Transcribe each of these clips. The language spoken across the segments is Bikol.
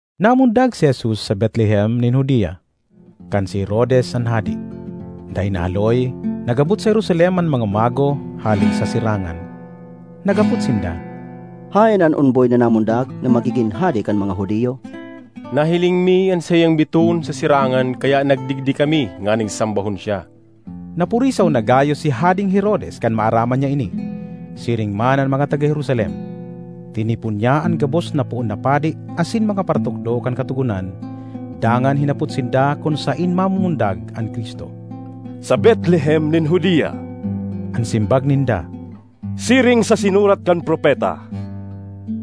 Namundag si Jesus sa Betlehem nin Judea, kan si Herodes an hade. Dai nahaloy, nag-abot sa Jerusalem an mga mago hale sa sirangan. Naghapot sinda, “Haen an omboy na namundag na magigin hade kan mga Judio? Nahiling mi an saiyang bitoon sa sirangan kaya nagdigdi kami nganing sambahon siya.” Napurisaw na gayo si Hadeng Herodes kan maaraman niya ini, siring man an mga taga Jerusalem. Tinipon niya an gabos na poon na padi asin mga paratukdo kan katogonan dangan hinapot sinda kun saen mamumundag an Cristo. ”Sa Betlehem nin Judea,” an simbag ninda, “siring sa sinurat kan propeta: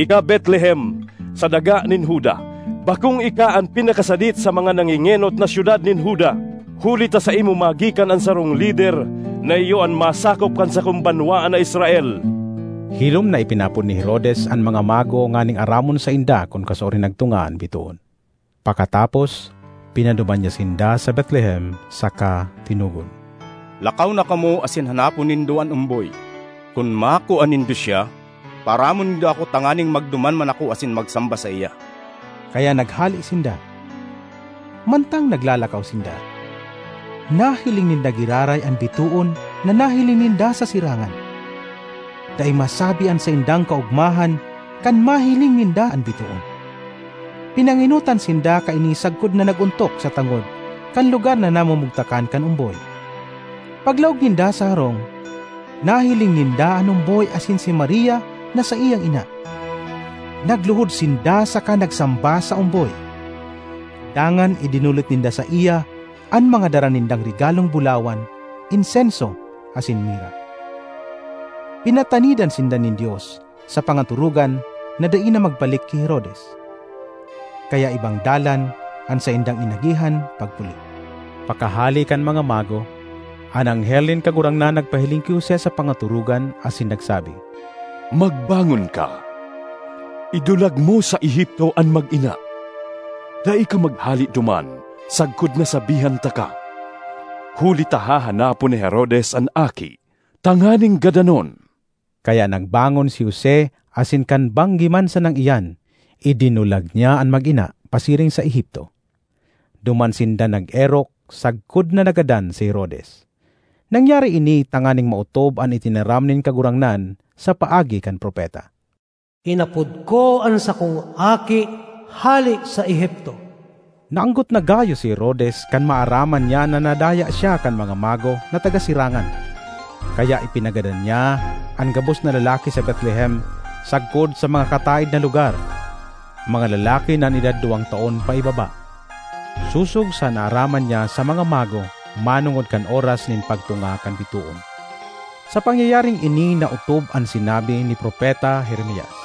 ‘Ika, Betlehem, sa daga nin Juda, bakong ika an pinakasadit sa mga nangengenot na syudad nin Juda; huli ta saimo magikan an sarong lider na iyo an masakop kan sakong banwaan na Israel.’” Hilom na ipinaapod ni Herodes an mga mago nganing aramon sainda kun kasuarin nagtunga an bitoon. Pakatapos, pinaduman niya sinda sa Betlehem saka tinugon, “Lakaw na kamo asin hanapon nindo an omboy; kun makua nindo siya, paaramon nindo ako tanganing magduman man ako asin magsamba saiya.” Kaya naghale sinda. Mantang naglalakaw sinda, nahiling ninda giraray an bitoon na nahiling ninda sa sirangan. Dai masabi an saindang kaogmahan kan mahiling ninda an bitoon! Pinangenotan sinda kaini sagkod na nag-ontok sa tangod kan lugar na namumugtakan kan omboy. Paglaog ninda sa harong, nahiling ninda an omboy asin si Maria na saiyang ina. Nagluhod sinda saka nagsamba sa omboy. Dangan idinolot ninda saiya an mga dara nindang regalong bulawan, insenso, asin mira. Pinatanidan sinda nin Dios sa pangatorogan na dai na magbalik ki Herodes. Kaya ibang dalan an saindang inagihan pagpuli. Pakahale kan mga mago, an anghel nin Kagurangnan nagpahiling ki Jose sa pangatorogan asin nagsabi, “Magbangon ka; idulag mo sa Egipto an mag-ina. Dai ka maghale duman sagkod na sabihan taka, huli ta hahanapon ni Herodes an aki tanganing gadanon.” Kaya nagbangon si Jose asin kan banggi man sanang iyan, idinulag niya an mag-ina pasiring sa Egipto. Duman sinda nag-erok sagkod na nagadan si Herodes. Nangyari ini tanganing maotob an itinaram nin Kagurangnan sa paagi kan propeta, “Inapod ko an sakong Aki hale sa Egipto.” Naanggot na gayo si Herodes kan maaraman niya na nadaya siya kan mga mago na taga sirangan. Kaya ipinagadan niya an gabos na lalaki sa Betlehem sagkod sa mga kataed na lugar, mga lalaki na an edad duwang taon paibaba, sosog sa naaraman niya sa mga mago manongod kan oras nin pagtunga kan bitoon. Sa pangyayaring ini naotob an sinabi ni Propeta Jeremias: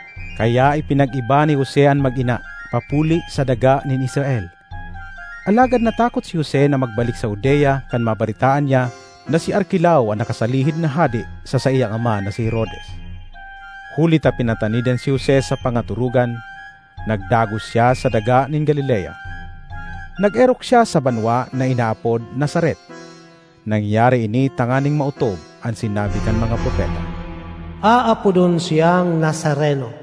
Kaya ipinag-iba ni Jose an mag-ina papuli sa daga nin Israel. Alagad natakot si Jose na magbalik sa Judea kan mabaretaan niya na si Arkelao an nakasalihid na hade sa saiyang ama na si Herodes. Huli ta pinatanidan si Jose sa pangatorogan, nagdagos siya sa daga nin Galilea. Nag-erok siya sa banwa na inaapod Nazaret. Nangyari ini tanganing maotob an sinabi kan mga propeta, “Aapodon siyang Nazareno.”